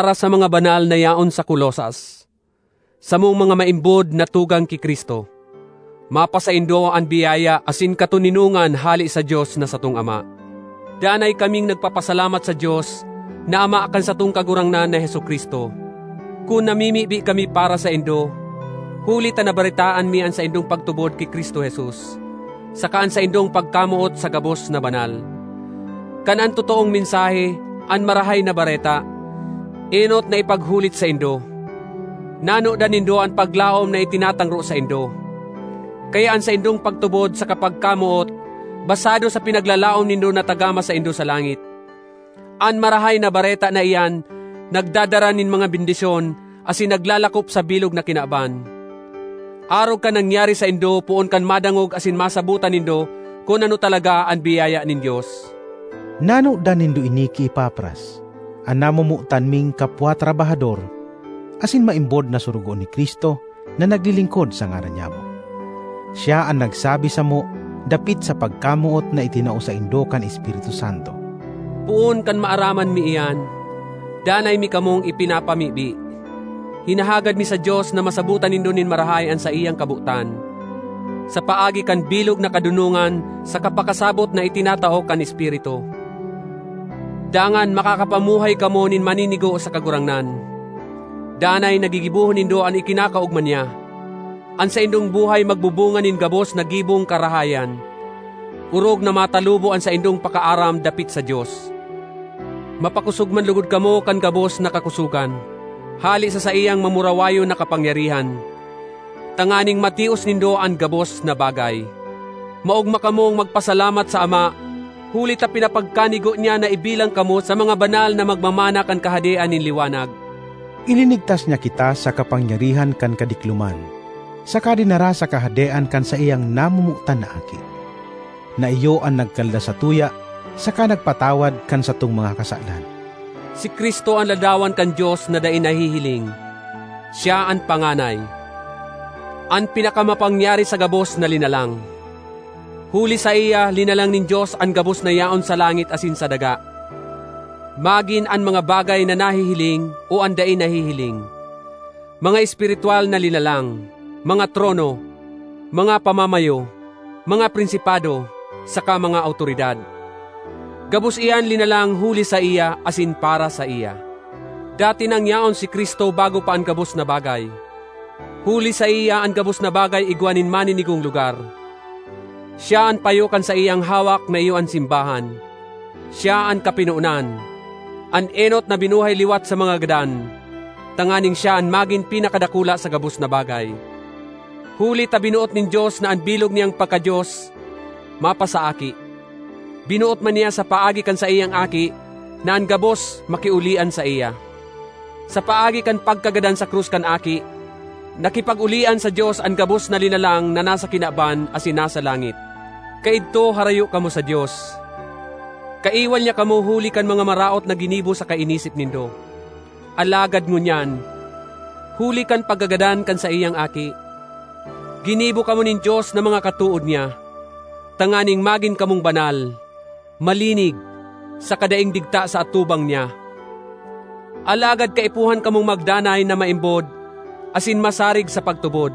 Para sa mga banal na yaon sa Colosas, samong mga maimbod na tugang ki Cristo: Mapasaindo an biyaya asin katoninongan hale sa Dios na satong Ama. Danay kaming nagpapasalamat sa Dios na Ama kan satong Kagurangnan na Jesu-Cristo, kun namimibi kami para saindo, huli ta nabaretaan mi an saindong pagtubod ki Cristo Jesus, saka an saindong pagkamoot sa gabos na banal. Kan an totoong mensahe, an Marahay na Bareta, enot na ipaghulit saindo, nanodan nindo an paglaom na itinatangro saindo. Kaya an saindong pagtubod saka pagkamoot basado sa pinaglalaom nindo na tagama saindo sa langit. An Marahay na Bareta na iyan nagdadara nin mga bendisyon asin naglalakop sa bilog na kinaban, arog kan nangyari saindo poon kan madangog asin masabotan nindo kun ano talaga an biyaya nin Dios. Nanodan nindo ini ki Epafras, an namomotan ming kapwa trabahador asin maimbod na sorogoon ni Cristo na naglilingkod sa ngaran nyamo. Siya an nagsabi samo dapit sa pagkamoot na itinao saindo kan Espiritu Santo. Poon kan maaraman mi iyan, danay mi kamong ipinapamibi. Hinahagad mi sa Dios na masabotan nindo nin marahay an saiyang kabotan, sa paagi kan bilog na kadonongan saka pakasabot na itinatao kan Espiritu. Dangan makakapamuhay kamo nin maninigo sa Kagurangnan; danay na gigibohon nindo an ikinakaogma niya. An saindong buhay magbubunga nin gabos na gibong karahayan, orog na matalubo an saindong pakaaram dapit sa Dios. Mapakosog man logod kamo kan gabos na kakosogan hale sa saiyang mamurawayon na kapangyarihan, tanganing matios nindo an gabos na bagay. Maogma kamong magpasalamat sa Ama huli ta pinapagkanigo niya na ibilang kamo sa mga banal na magmamana kan kahadean nin liwanag. Ilinigtas niya kita sa kapangyarihan kan kadikloman saka dinara sa kahadean kan saiyang namomotan na Aki, na iyo an nagkalda satuya saka nagpatawad kan satong mga kasalan. Si Cristo an ladawan kan Dios na dai nahihiling. Siya an panganay—an pinakamapangyari sa gabos na linalang. Huli saiya linalang nin Dios an gabos na yaon sa langit asin sa daga, magin an mga bagay na nahihiling o an dai nahihiling: mga espiritwal na linalang, mga trono, mga pamamayo, mga prinsipado, saka mga awtoridad—gabos iyan linalang huli saiya asin para saiya. Dati nang yaon si Cristo bago pa an gabos na bagay; huli saiya an gabos na bagay igwa nin maninigong lugar. Siya an payo kan saiyang hawak na iyo an simbahan; siya an kapinonan, an enot na binuhay liwat sa mga gadan tanganing siya an magin pinakadakula sa gabos na bagay. Huli ta binoot nin Dios na an bilog niyang pagka-Dios mapasa Aki. Binoot man niya sa paagi kan saiyang Aki na an gabos makiolian saiya. Sa paagi kan pagkagadan sa krus kan Aki, nakipag-olian sa Dios an gabos na linalang na nasa kinaban asin nasa langit. Kaidto harayo kamo sa Dios; kaiwal niya kamo huli kan mga maraot na ginibo saka inisip nindo. Alagad ngunyan, huli kan pagkagadan kan saiyang Aki, ginibo kamo nin Dios na mga katood niya, tanganing magin kamong banal, malinig, saka daing digta sa atubang niya. Alagad kaipuhan kamong magdanay na maimbod asin masarig sa pagtubod.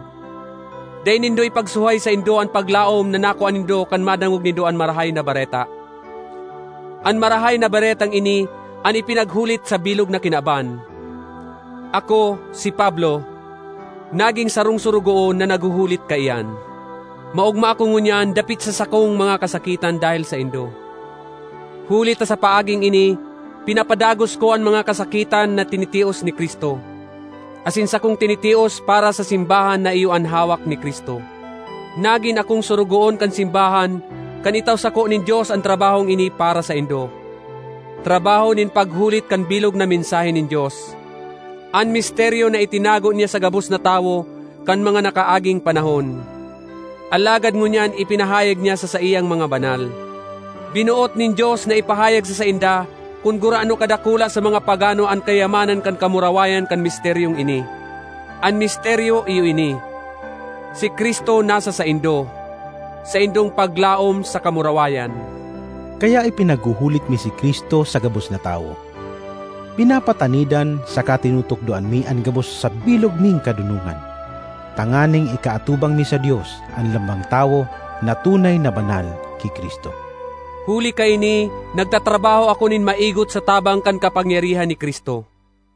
Dai nindo ipagsuhay saindo an paglaom na nakua nindo kan madangog nindo an Marahay na Bareta. An Marahay na Baretang ini an ipinaghulit sa bilog na kinaban; ako, si Pablo, naging sarong sorogoon na naghuhulit kaiyan. Maogma ako ngunyan dapit sa sakong mga kasakitan dahel saindo, huli ta sa paaging ini pinapadagos ko an mga kasakitan na tinitios ni Cristo, asin sakong tinitios para sa simbahan na iyo an hawak ni Cristo. Nagin akong sorogoon kan simbahan kan itao sako nin Dios an trabahong ini para saindo, trabaho nin paghulit kan bilog na mensahe nin Dios, an misteryo na itinago niya sa gabos na tawo kan mga nakaaging panahon, alagad ngunyan ipinahayag niya sa saiyang mga banal. Binoot nin Dios na ipahayag sa sainda kun gurano kadakula sa mga pagano an kayamanan kan kamurawayan kan misteryong ini. An misteryo iyo ini: si Cristo nasa saindo, saindong paglaom sa kamurawayan. Kaya ipinaghuhulit mi si Cristo sa gabos na tawo. Pinapatanidan saka tinutukdoan mi an gabos sa bilog ming kadonongan tanganing ikaatubang mi sa Dios an lambang tawo na tunay na banal ki Cristo. Huli kaini nagtatrabaho ako nin maigot sa tabang kan kapangyarihan ni Cristo.